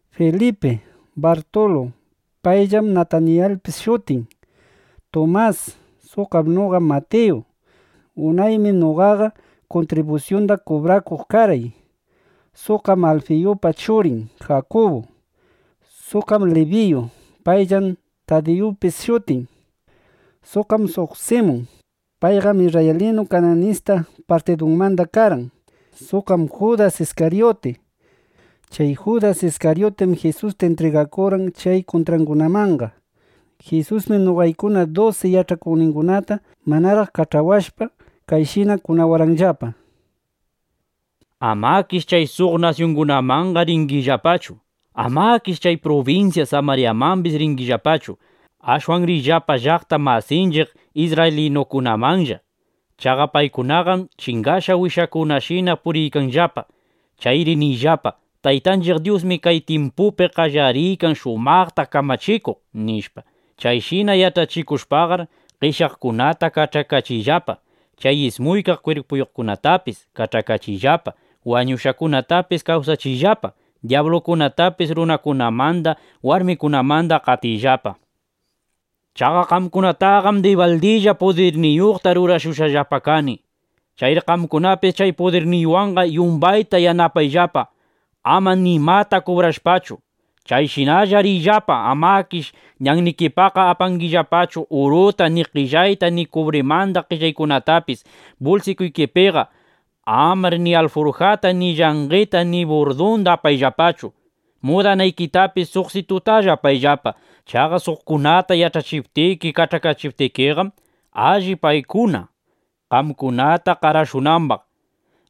Filipi, Bartulu (payllam Natanayilpis shutin), Tumas. Suqqam noqa Matiyu. Unaymi noqaqa kuntribusyunda kubrakuq karqay. Suqqam Alfiyupa churin Jakubu. Suqqam ˻Libiyu; payllam˼ Tadiyupis shutin. Suqqam suq Simun. Payqam isrraylinu Kananista partidumanda karqan. Suqqam Judas Iskaryuti. Chay Judas Iskaryutim Jisusta intrigakurqan chay kuntraqkunamanqa. Jisusmi noqaykuna dusi yach'akuqningunata manaraq kach'awashpa, kayshina kunawarqanllapa: —Amakish chay suq nasyungunamanqa ringillapachu. Amakish chay prubinsya Samaryamambis ringillapachu. Ashwan riyllapa llaqta masinchiq isrraylinukunamanlla. Chaqa paykunaqam chingashqa wishakunashina puriykanllapa. Chayri niyllapa: “Taytanchiq Dyusmi kay tyimpupi qallariykan shumaqta kamachikuq”, nishpa. Chayshina yach'achikushpaqar, qeshyaqkunata kach'akachiyllapa. Chay ismuykaq kwirpuyuqkunatapis kach'akachiyllapa. Wañushqakunatapis kawsachiyllapa. Dyablukunatapis runakunamanda, warmikunamanda qatiyllapa. Chaqa qamkunataqam dibaldilla pudirniyuqta rurashushqallapa kani. Chayri qamkunapis chay pudirniywanqa yumbayta yanapayllapa, ama nimata kubrashpachu. ’Chayshinalla riyllapa. Amakish ñannikipaqqa apangillapachu uruta, ni qellayta ni kubrimanda qellaykunatapis bulsikuykipiqa. Amar ni alfurjata ni llanqeta ni burdunda apayllapachu. Mudanaykitapis suqsitutalla apayllapaqa. Chaqa suqkunata yach'achiptiki, kach'akachiptikiqam, alli paykuna qamkunata qarashunambaq.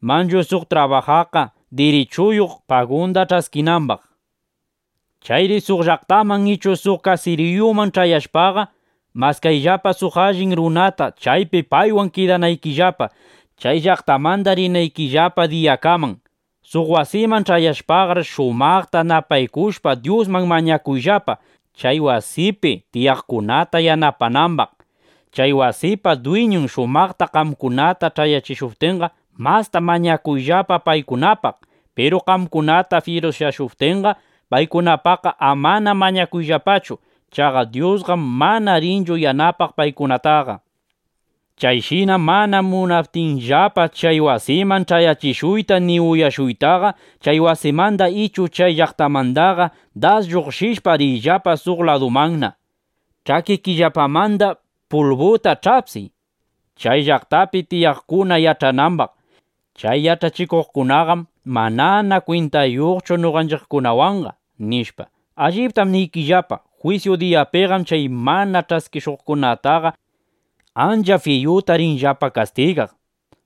Manchu suq trabajaqqa dirichuyuq, pagunda ch'askinambaq. ’Chayri suq llaqtaman ichu suq kasiriyuman ch'ayashpaqa, maskayllapa suq allin runata, chaypi paywan kidanaykillapa, chay llaqtamanda rinaykillapa diyakaman. Suq wasiman ch'ayashpaqar, shumaqta napaykushpa, Dyusman mañakuyllapa, chay wasipi tiyaqkunata yanapanambaq. Chay wasipa dwiñun shumaqta qamkunata ch'ayachishuptinqa, masta mañakuyllapa paykunapaq. Piru qamkunata fyirusyashuptinqa, paykunapaqqa amana mañakuyllapachu. Chaqa Dyusqam mana rinchu yanapaq paykunataqa. Chayshina mana munaptinllapa chay wasiman ch'ayachishuyta ni uyashuytaqa, chay wasimanda ichu chay llaqtamandaqa das lluqshishpa, riyllapa suq ladumanna. Ch'akikillapamanda pulbuta ch'apsiy, chay llaqtapi tiyaqkuna yach'anambaq: Chay yach'achikuqkunaqam manana kwintayuqchu noqanchiqkunawanqa, nishpa. Alliptam niykillapa, jwisyu diyapiqam chay mana ch'askishuqkunataqa ancha fiyuta rinllapa kastigaq,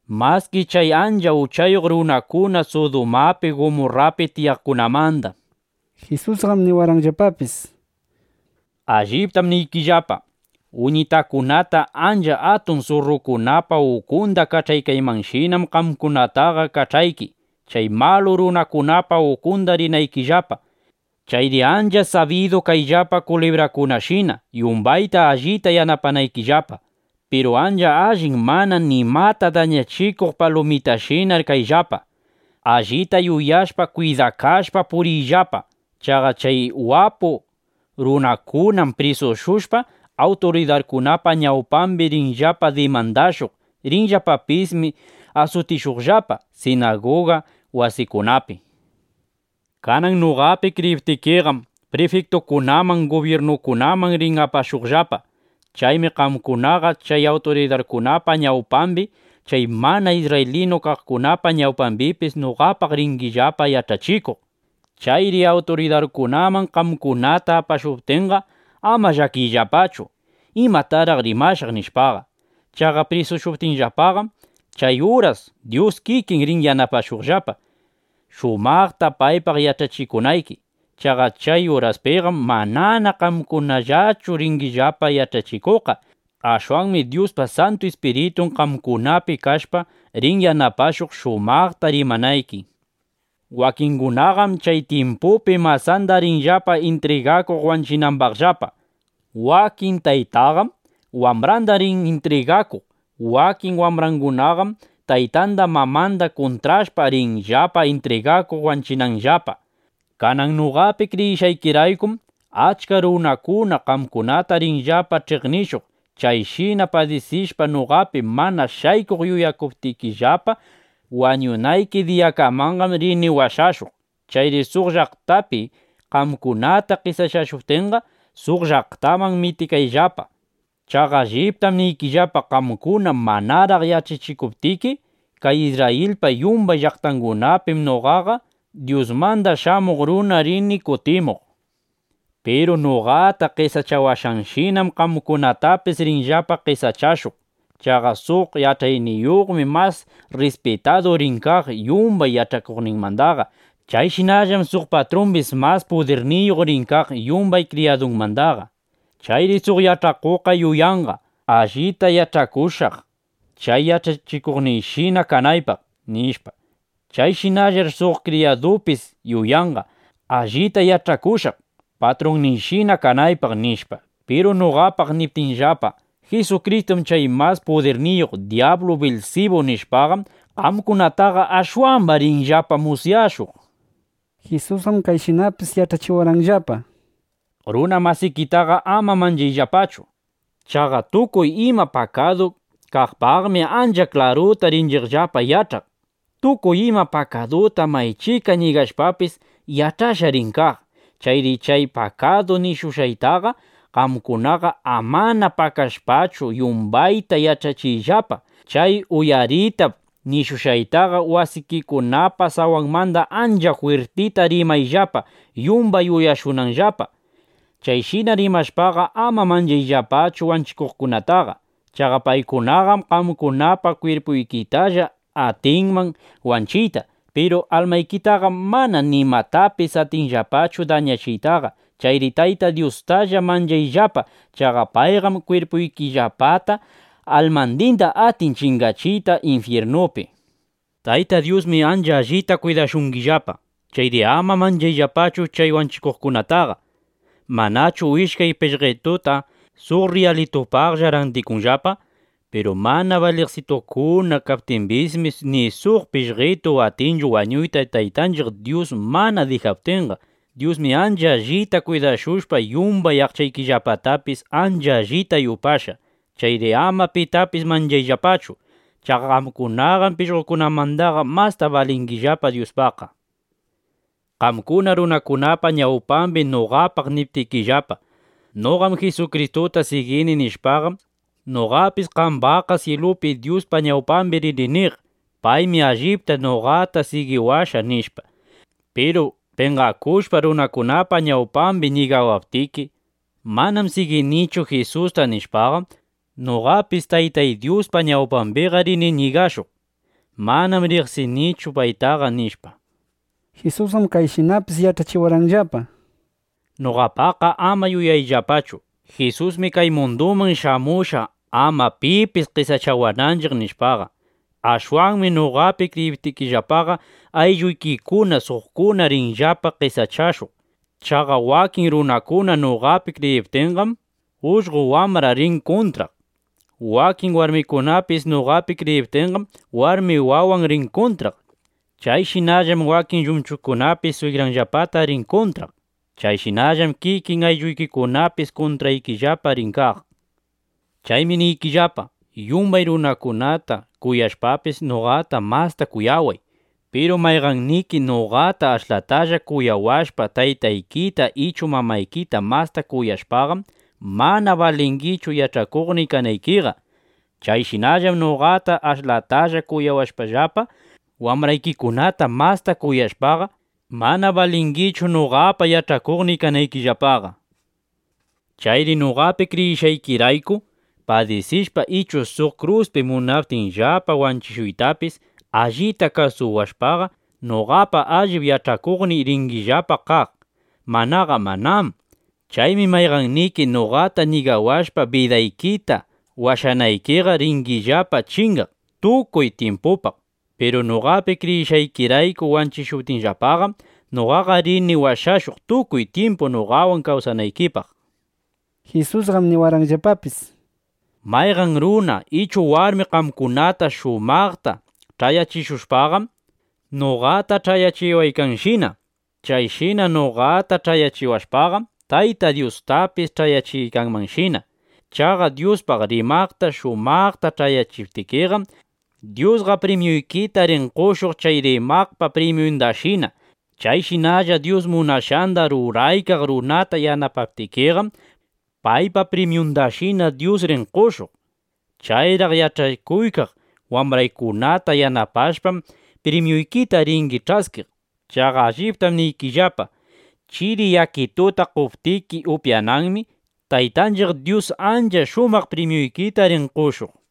maski chay ancha uchayuq runakuna Sudumapi, Gumurrapi tiyaqkunamanda. Jisusqam niwarqanllapapis: —¡Alliptam niykillapa! Uñitakunata ancha atun surrukunapa ukunda kach'aykaymanshinam, qamkunataqa kach'ayki, chay malu runakunapa ukunda rinaykillapa. Chayri ancha sabidu kayllapa kulibrashina, yumbayta allita yanapanaykillapa. Piru ancha allin mana nimata dañachikuq palumitashinar kayllapa. Allita yuyashpa, kwidakashpa puriyllapa. Chaqa chay wapu runakunam prisushushpa, awturidarkunapa ñawpambi rinllapa dimandashuq. Rinllapapismi asutishuqllapa sinaguga wasikunapi. Kanan noqapi kriyiptikiqam, prifiktukunaman, gubyirnukunaman rin apashuqllapa. Chaymi qamkunaqa chay awturidarkunapa ñawpambi, chay mana isrraylinu kaqkunapa ñawpambipis noqapaq ringillapa yach'achikuq. Chayri awturidarkunaman qamkunata apashuptinqa, ama llakiyllapachu: ¿Imataraq rimashaq? nishpaqa. Chaqa prisushuptinllapaqam, chay uras Dyus kikin rin yanapashuqllapa, shumaqta paypaq yach'achikunayki. Chaqa chay uraspiqam manana qamkunallachu ringillapa yach'achikuqqa. Ashwanmi Dyuspa Santu Ispiritun qamkunapi kashpa, rin yanapashuq, shumaqta rimanayki. ’Wakingunaqam chay tyimpupi masanda rinllapa intrigakuq wanchinambaqllapa. Wakin taytaqam wambranda rin intrigakuq. Wakin wambrangunaqam taytanda mamanda kuntrashpa, rinllapa intrigakuq wanchinambaqllapa. Kanan noqapi kriyishqaykiraykum, achka runakuna qamkunata rinllapa ch'iqnishuq. Chayshina padisishpa, noqapi mana shaykuq yuyakuptikillapa wañunayki diyakamanqam, rini washashuq. Chayri suq llaqtapi qamkunata qesachashuptinqa, suq llaqtaman mitikayllapa. Chaqa alliptam niykillapa, qamkuna manaraq yach'achikuptiki kay Isrrayilpa yumbay llaqtangunapim, noqaqa Dyusmanda Shamuq Runa rini kutimuq. ’Piru noqata qesachawashqanshinam, qamkunatapis rinllapa qesachashuq. Chaqa suq yach'achikuqmi mas rrispitadu rin kaq yumbay yach'akuqninmandaqa. Chayshinallam suq patrumbis mas pudirniyuq rin kaq yumbay kriyadunmandaqa. Chayri suq yach'akuqqa yuyanqa: Allita yach'akushaq, chay yach'achikuqniyshina kanaypaq, nishpa. Chayshinallar suq kriyadupis yuyanqa: Allita yach'akushaq, patrunniyshina kanaypaq, nishpa. Piru noqapaq niptinllapa: “¡Jisukristum chay mas pudirniyuq dyablu Bilsibu!” nishpaqam, qamkunataqa ashwamba rinllapa musyashuq. Jisusqam kayshinapis yach'achiwarqanllapa: —Runa masikitaqa ama manchayllapachu. Chaqa tukuy ima pakadu kaqpaqmi ancha klaruta rinchiqllapa yach'aq. Tukuy ima pakaduta maychika ñigashqapis, yach'ashqa rin kaq. Chayri chay pakadu nishushqaytaqa, qamkunaqa amana pakashpachu, yumbayta yach'achiyllapa. Chay uyaritap nishushqaytaqa, wasikikunapa sawanmanda ancha jwirtita rimayllapa, yumbay uyashunanllapa. Chayshina rimashpaqa, ama manchayllapachu wanchikuqkunataqa. Chaqa paykunaqam qamkunapa kwirpuykitalla atinman wanchiyta. Piru almaykitaqam mana nimatapis atinllapachu dañachiytaqa. Chayri Taytay Dyustalla manchayllapa. Chaqa payqam kwirpuykillapata almandinda atin chingachiyta infyirnupi. ’(Tayta Dyusmi ancha allita kwidashungillapa. Chayri ama manchayllapachu chay wanchikuqkunataqa.) ¿Manachu ishkay pishqetuta suq rriyalitupaqlla randikunllapa? Piru mana baliqsitukuna kaptimbismi, ni suq pishqetu atinchu wañuyta Taytanchiq Dyus mana dijaptinqa. Dyusmi ancha allita kwidashushpa, yumbay aqchaykillapatapis ancha allita yupashqa. Chayri ama pitapis manchayllapachu. Chaqa qamkunaqam pishqokunamandaqa masta balingillapa Dyuspaqqa. ’Qamkuna runakunapa ñawpambi noqapaq niptikillapa: “Noqam Jisukristuta sigini” nishpaqam, noqapis qambaqqa syilupi Dyuspa ñawpambi rini niq: “Paymi allipta noqata sigiwashqa”, nishpa. Piru penqakushpa, runakunapa ñawpambi ñigawaptiki: “Manam siginichu Jisusta”, nishpaqam, noqapis Taytay Dyuspa ñawpambiqa rini ñigashuq: “Manam riqsinichu paytaqa”, nishpa. Jisusqam kayshinapis yach'achiwarqanllapa: —Noqapaqqa ama yuyayllapachu: Jisusmi kay munduman shamushqa, ama pipis qesachawananchiq, nishpaqa. Ashwanmi noqapi kriyiptikillapaqa, aylluykikuna, suqkuna rinllapa qesachashuq. Chaqa wakin runakuna noqapi kriyiptinqam, ullqo wambran rin kuntraq. Wakin warmikunapis noqapi kriyiptinqam, warmi wawan rin kuntraq. Chayshinallam wakin llumchukunapis swigranllapata rin kuntraq. Chayshinallam kikin aylluykikunapis kuntraykillapa rin kaq. ’(Chaymi niykillapa, yumbay runakunata kuyashpapis, noqata masta kuyaway.) Piru mayqanniki noqata ashlatalla kuyawashpa, taytaykita ichu mamaykita masta kuyashpaqam, mana balingichu yach'akuqniy kanaykiqa. Chayshinallam noqata ashlatalla kuyawashpallapa, wambraykikunata masta kuyashpaqa, mana balingichu noqapa yach'akuqniy kanaykillapaqa. Chayri noqapi kriyishqaykirayku padisishpa ichu suq kruspi munaptinllapa wanchishuytapis, allita kasuwashpaqa, noqapa allip yach'akuqniy ringillapa kaq; manaqa manám. Chaymi mayqanniki noqata ñigawashpa bidaykita washanaykiqa, ringillapa chingaq tukuy tyimpupaq. Piru noqapi kriyishqaykirayku wanchishuptinllapaqam, noqa rini washashuq, tukuy tyimpu noqawan kawsanaykipaq. Jisusqam niwarqanllapapis: —Mayqan runa ichu warmi qamkunata shumaqta ch'ayachishushpaqam, noqata ch'ayachiwaykanshina. Chayshina noqata ch'ayachiwashpaqam, Taytay Dyustapis ch'ayachiykanmanshina. Chaqa Dyuspaq rimaqta, shumaqta ch'ayachiptikiqam, Dyusqa primyuykita rin qoshuq chay rimaqpa primyundashina. Chayshinalla Dyus munashqanda ruraykaq runata yanapaptikiqam, paypa primyundashina Dyus rin qoshuq. Chayraq yach'akuykaq wambraykunata yanapashpam, primyuykita ringi ch'askiq. Chaqa allipta niykillapa, chiri yakituta qoptiki upyananmi, Taytanchiq Dyus ancha shumaq primyuykita rin qoshuq, nishpa.